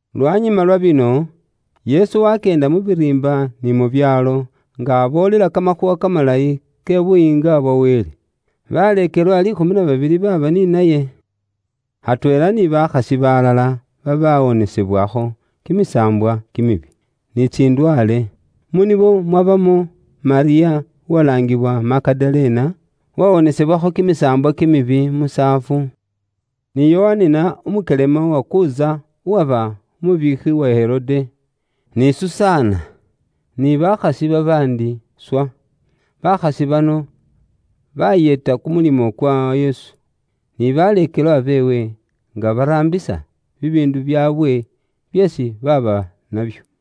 Lwanyuma lwa bino, Yesu wakyeenda mu biriimba ni mu byaalo, nga aboolela kamakhuuwa kamalayi ke Buyiinga bwa Wele. Baleekelwa liikhumi na babili baaba ni naye, atweela ni bakhasi balala babawonesebwakho kimisaambwa kimibi, ni tsindwaale. Mu nibo mwabamo: Malyamu uwalaangiwa Magadalena, uwawoonebwakho kimisaambwa kimibi musaafu, ni Yohanina umukyelema wa Kuza uwaba umubiikhi wa Herode, ni Susana, ni bakhasi babaandi swa. Bakhasi bano baayeeta kumulimo kwa Yesu, ni baleekelwa beewe, nga baraambisa bibiindu byaabwe byeesi baaba nabyo.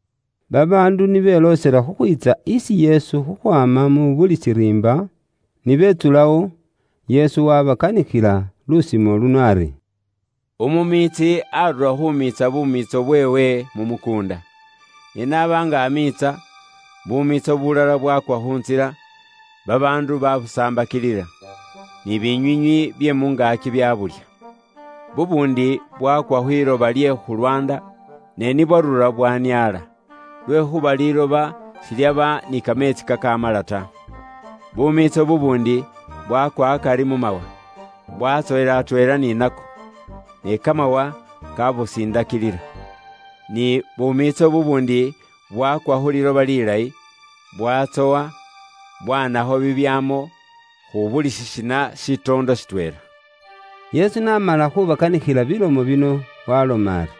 Babaandu ni beloosela khukhwiitsa isi Yesu khukhwaama mu buli shiriimba, ni betsulawo, Yesu waabakanikhila lusimo luno ari: “Umumiitsi aarura khuumiitsa bumiitso bweewe mu mukuunda. Ne n'aba nga amiitsa, bumiitso bulala bwakwa khu ntsila, babaandu baabusambakilila, ni binywiinywi bye mu ngaaki byabulya. Bubuundi bwakwa khwiloba lye khu lwaanda, ne ni bwaarura bwaniaala, lwekhuuba liiloba shilyaba ni kameetsi kakaamala ta. Bumiitso bubuundi bwakwa akari mu mawa, bwatsowela atweela ni nako, ni kamawa kabusindakilila. Ni bumiitso bubuundi bwakwa khu liiloba liilayi, bwatsowa, bwaanakho bibyaamo, khu buli shisina shitoondo shitweela.” Yesu n'amala khubakanikhila bilomo bino, waaloma ari,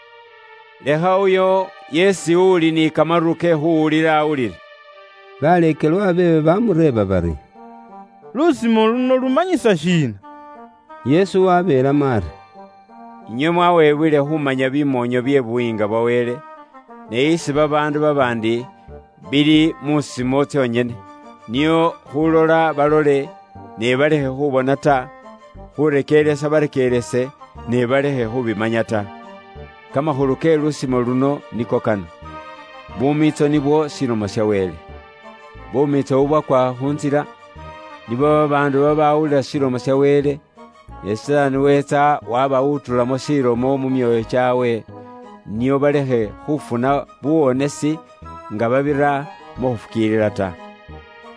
“Lekha uyo yeesi uli ni kamaru ke khuwulila awulile.” Baleekelwa beewe bamureeba bari, “Lusimo luno lumanyisa shiina?” Yesu wabeelamo ari, “Inywe mwawebwele khumanya bimoonyo bye Buyiinga bwa Wele, ne isi babaandu babaandi, bili musimo tsonyene, nio, khulola balole, ne balekhe khubona ta; khurekeeresa barekeerese, ne balekhe khubimanya ta.” “Kamakhulu ke lusimo luno niko kano, bumiitso nibwo Ilomo ya Wele. Bumiitso bubwakwa khu ntsila, nibo babaandu babaawulila Ilomo ya Wele, ne Sitaani weetsa wabawutulamo Ilomo iyo mu myoyo kyaabwe, nio balekhe khufuna buuwonesi nga babira mu khufukiilila ta.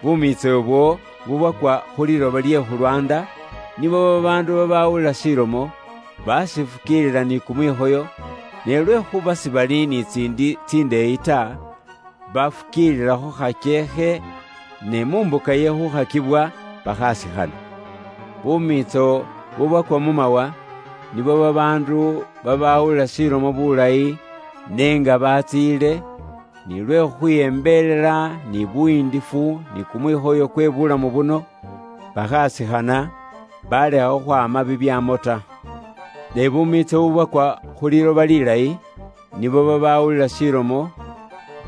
Bumiitso ibwo bubwakwa khu liiloba lye khu lwaanda, nibo babaandu babawulila Ilomo, bakifukiilila ni kumwikhoyo, ne lwekhuuba sibali ni tsiindi tsindeeyi ta, bafukiililakho khakyeekhe, ne mu mbuka ye khuukhakibwa, bakhasikhana. Bumiitso bubwakwa mu mawa, nibo babaandu, babaawulila Ilomo bulayi, ne nga baatsiile, nilwe khukhwiyembelela, ni buyiindifu, ni kumwikhoyo kwe buulamu buno, bakhasikhana, baalekha khwaama bibyaamo ta. Ne bumiitso bubwakwa khu liiloba lilayi, nibo babaawulila Ilomo,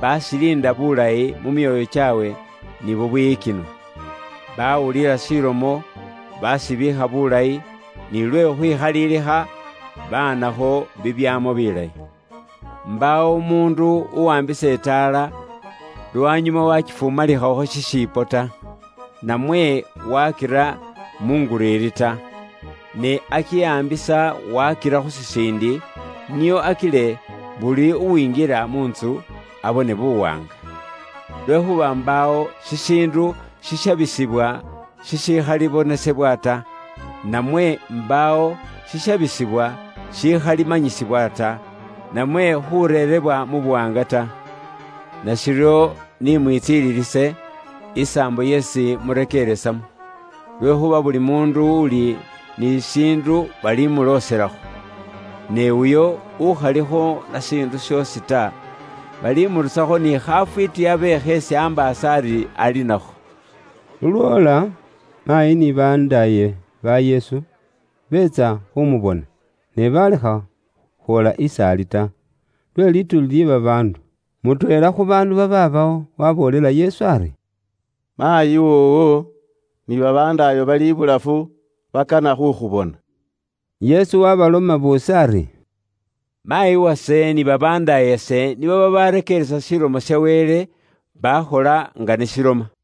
bakiiliinda bulayi mu myoyo kyaabwe ni bubwiyikinwa. Bawulila Ilomo, bakibiikha bulayi, ni lwe khukhwikhalilikha, baanakho bibyaamo bilayi.” “Mbaawo umuundu uwaambisa itaala, lwanyuma waakifumalikhakho shishipo ta, namwe waakira munguriiri ta. Ne akiwaambisa, waakira khu shisiindi, nio akile buli uwingila mu ntsu abone buwaanga. “Lwekhuuba mbaawo shishiindu shishabisibwa, shikhalibonesebwa ta. Namwe, mbaawo shishabisibwa shikhalimanyisibwa ta, namwe khureerebwa mu buwaanga ta. “Nashiryo ni mwitsililise, isaambo yeesi murekeeresamo. Lwekhuuba buli muundu uli ni shishiindu balimuloselakho. Ne uyo ukhalikho na shiindu shoosi ta, balimurusakho ni khafwiiti abe kheesi ambaasa ari ali nakho.” Lulwoola, maayi ni babandaaye ba Yesu, beetsa khumubona, ne baalekha khwoola is'ali ta, lwe lituuli lye babaandu. Mutweela khu baandu babaabawo waaboolela Yesu ari, “Maayi woowo, ni babandaayo bali ibulafu bakana khukhubona.” Yesu waabaloma boosi ari, “Maayi wase ni babandaayase nibo babaarekeeresa Ilomo ya Wele, baakhola nga n'iloma.”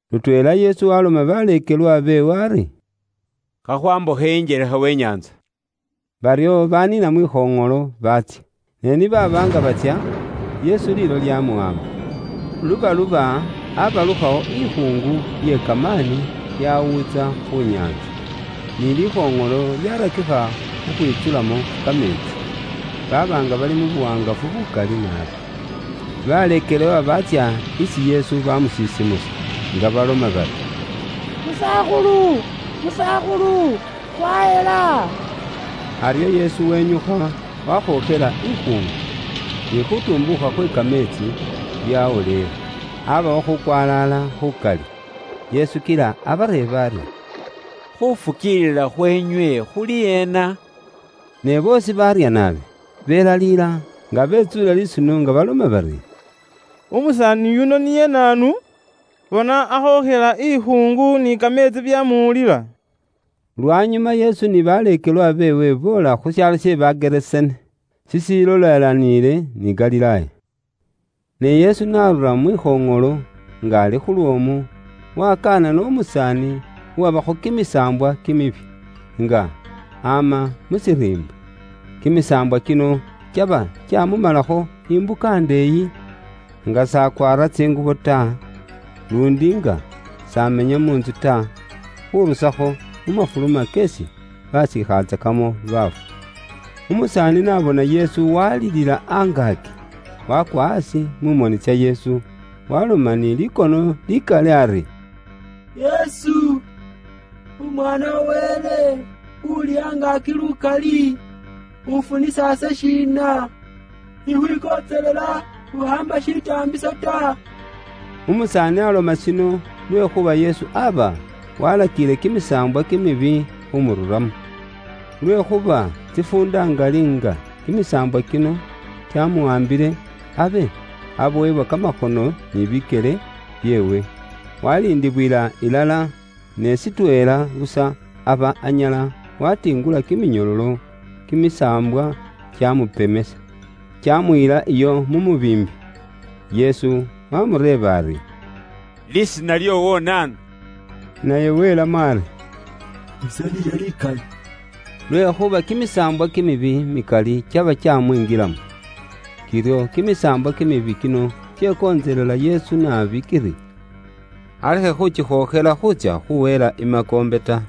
Lutweela Yesu waloma baleekelwa beewe ari, “Kha khwambukhe injelekha we nyaantsa.” Baryo baniina mwikhoŋolo baatsya. Ne ni baaba nga batsya, Yesu liilo lyamuwaamba. Lubaluba abalukhawo ikhuungu ye kamaani yawuutsa khu nyaantsa, ni likhoŋolo lyarakikha khukhwitsulamo kameetsi, baaba nga bali mu buwaangafu bukali naabi. Baleekelwa baatsya isi Yesu bamusisimusa, nga baloma bari, “Musakhulu, Musakhulu, khwahela!.” Aryo Yesu wenyukha, wakhookhela ikhuungu, ni khutumbuukha khwe kameetsi, byawoleela; abawo khukwalaala khukali. Yesu kila abareeba ari, “Khufukiilila khweenywe khuli ena?” Ne boosi baarya naabi, belaliila nga betsuule lisuno nga baloma bari, “Umusaani yuno niye naanu, bona akhookhela ikhuungu ni kameetsi byamuwulila?” Lwanyuma Yesu ni baleekelwa beewe boola khu shaalo she Bagerasene, shishilolelaniile ni Galilaaya. Ne Yesu n'arura mwikhoŋolo, nga ali khu lwoomu, wakanana umusaani uwabakho kimisaambwa kimibi, nga ama mu shiriimba. Kimisaambwa kino kyaba kyamumalakho imbuka indeeyi, nga s'akwaara tsingubo ta, luundi nga s'amenya mu ntsu ta, khurusakho mu mafuluma keesi basiikhatsakamo baafu. Umusaani n'abona Yesu, walilila angaaki, wakwa aasi mu moni tsa Yesu, waloma ni likono likali ari, “Yesu, Umwaana wa Wele Uuli Angaaki lukali, ufunisa ise shiina? Ikhwikontselela ukhaamba shitaambiso ta.” Umusaani aloma aryo lwekhuuba Yesu aba walakiile kimisaambwa khumururamo. Lwekhuuba tsifuunda ngali, nga kimisaambwa kino kyamuwaambile, abe abowebwa kiminyololo kamakhono ni bikyele byeewe, waliindibwila ilala, ne shitweela busa, aba anyala watingula kiminyololo, kimisaambwa kyamupemesa, kyamuyila iyo mu mubiimbi. Yesu waamureeba ari, “Lisiina lyoowo naanu?” Naye welamo ari, “Ise liiye likali.” Lwekhuuba kimisaambwa kimibi mikali kyaba kyamwingilamo. Kiryo kimisaambwa kimibi kino kyekontselela Yesu naabi kiri alekhe khukikhookhela khuutsya khuwelela imakoombe ta.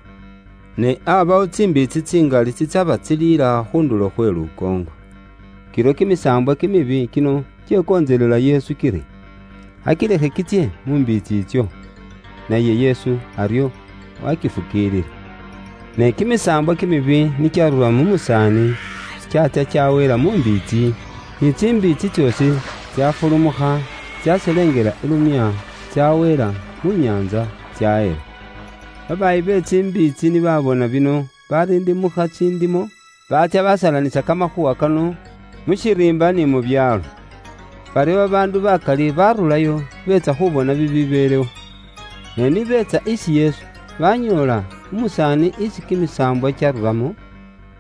Ne aabawo tsimbiitsi tsingali tsitsaba tsiliila khu ndulo khwe lukoongo. Kiryo kimisaambwa kimibi kino kyekontselela Yesu kiri, akilekhe kitsye mu mbiitsi itso, naye Yesu aryo, waakifukiilila. Ne kimisaambwa kimibi ni kyarura mu musaani, kyaatsya kyaweela mu mbiitsi, ni tsimbiitsi tsoosi tsafulumukha, tsaselengela ilumya, tsaweela mu nyaantsa, tsahela. Babaayi be tsimbiitsi ni babona bino, barindimukha tsindimo, baatsya basalanisa kamakhuuwa kano mu shiriimba ni mu byaalo. Baryo babaandu bakali barurayo beetsa khubona bibibeelewo. Ne ni beetsa isi Yesu, banyoola umusaani isi kimisaambwa kyaruramo,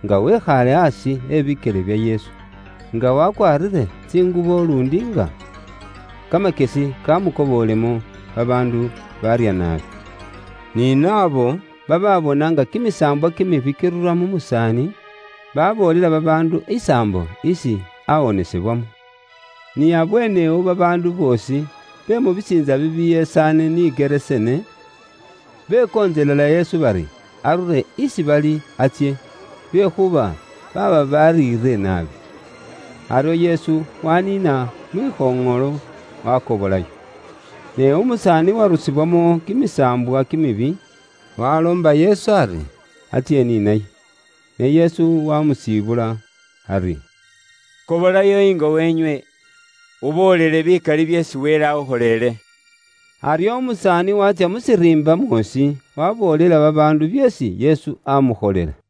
nga wekhaale aasi abikyele bya Yesu, nga wakwaarire tsingubo, luundi nga kamakyesi kamukobolemo; babaandu baarya naabi. Ni naabo babaabona nga kimisaambwa kimibi kirura mu musaani, baboolela babaandu isaambo isi awonesebwamo. Ni abweenewo, babaandu boosi be mu bisiintsa bibyesaane ni Gerasene, bekontselela Yesu bari, arure isi bali atsye, lwekuba baaba bariire naabi. Aryo Yesu waniina mwikhoŋolo, wakobolayo. Ne umusaani uwarusibwamo kimisaambwa kimibi, waloomba Yesu ari, atsye ni naye. Ne Yesu wamusiibula ari, “Kobolayo ingo weenywe, uboolele bikali byeesi Wele akhukholele.” Aryo umusaani waatsya mu shiriimba mwoosi, waboolela babaandu byeesi Yesu amukholela.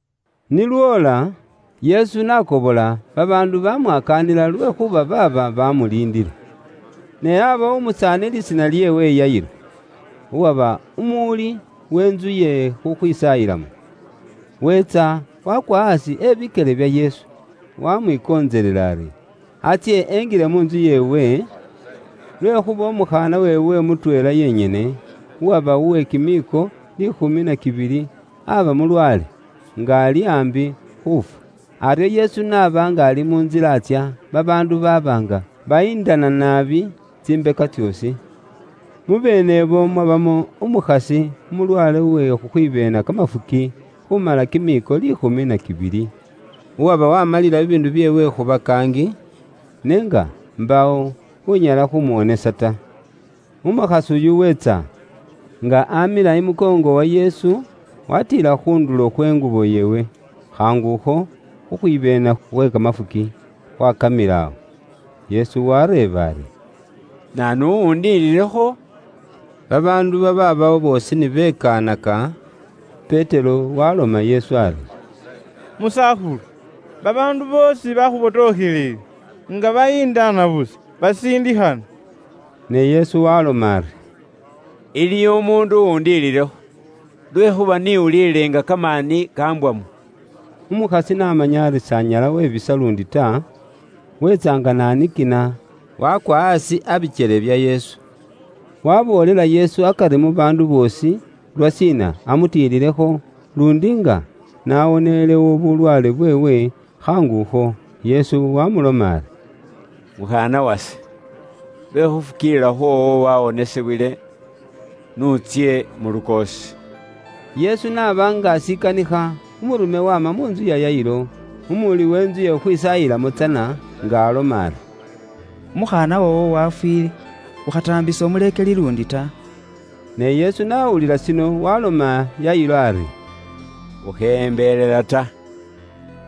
Ni lwoola, Yesu n'akobola, babaandu bamwakaanila lwekhuuba baaba bamuliindile. Ne aabawo umusaani lisiina lyeewe Yayiro, uwaba umuwuli w'entsu ye khukhwisaayilamo, weetsa, waakwa aasi abikyele bya Yesu, waamwikontselela ari atsye, enjile mu ntsu yeewe, lwekhuuba umukhaana weewe mutweela yenyene, uwaba uwe kimiiko liikhumi na kibili, aba mulwaale, nga ali aambi khuufwa. Aryo Yesu n'aba nga ali mu ntsila atsya, babaandu baaba nga bayindana naabi tsimbeka tsoosi. Mubeene ibo mwabamo umukhasi umulwaale we khukhwibeena kamafuki khumala kimiiko liikhumi na kibili; uwaba wamalila bibiindu bye mu bulamu bweewe khu bakaangi, n'enga mbaawo unyala khumuwonesa ta. Umukhasi uyu weetsa, nga amila imukoongo wa Yesu, watiila khu ndulo khwe ngubo yeewe, khaangu akho khukhwibeena khwe kamafuki khwakamilawo. Yesu wareeba ari, “Naanu uwundiililekho?” Babaandu babaabawo boosi ni bekaanaka, Petero waloma Yesu ari, “Musakhulu, babaandu boosi bakhubotokhelele nga bayindana busa, basiindikhana.” Ne Yesu waaloma ari, “Iliwo umuundu uwundiililekho, lwekhuuba ise niwuulile nga kamaani kambwamo.” Umukhasi n'amanya ari s'anyala webisa luundi ta, weetsa nga nanikina, wakwa aasi abikyele bya Yesu. Waboolela Yesu akari mu baandu boosi, lwashiina amutiililekho, luundi nga nawonelewo bulwaale bweewe khaangu akho. Yesu wamuloma ari, “Mukhaana wase, lwe khufukiilila khwoowo wawonisibwile. N'utsye mu lukoosi.” Yesu n'aba nga ashikanikha, umurume waama mu ntsu ya Yayiro, umuraangilisi tsana w'entsu ye khukhwisaayilamo, nga aloma ari, “Umukhaana woowo wafwiile, ukhataambisa umuleekeli luundi ta.” Ne Yesu n'awulila shino, waloma Yayiro ari, “Ukheyembelela ta,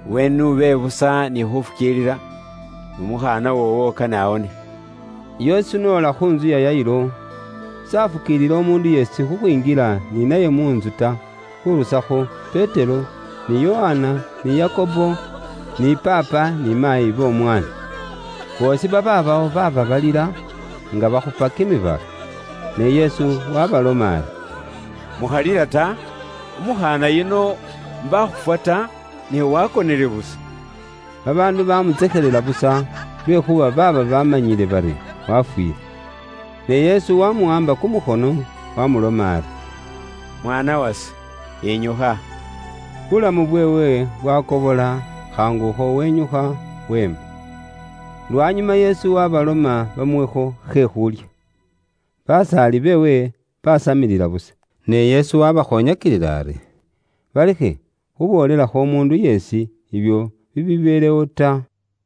iwe n'ube busa ni khufukiilila, n'umukhaana woowo kane awonesebwe.” Yesu n'ola khu ntsu ya Yayiro, s'afukiilila umuundu yeesi khukhwinjila ni naye mu ntsu ta, khurusakho Petero, ni Yokana, ni Yakobo, ni paapa ni maayi b'omwaana. Boosi babaabawo baaba balila, nga bakhupa kimibala. Ne Yesu waabaloma ari, “Mukhalila ta, umukhaana yuno mbakhufwa ta, ne wakonele busa.” Babaandu bamutsekhelela busa, lwekhuuba baaba bamanyile bari wafwiile. Ne Yesu wamuwaamba kumukhono, wamuloma ari, “Mwaana wase, yinyukha.” Bulamu bweewe bwakobola, khaangu akho wenyukha weema. Lwanyuma Yesu waabaloma bamuwekho khe khuulya. Basaali beewe baasamilila busa, ne Yesu waabakhoonyakilila ari, balekhe khuboolelakho umuundu yeesi ibyo bibibeelewo ta.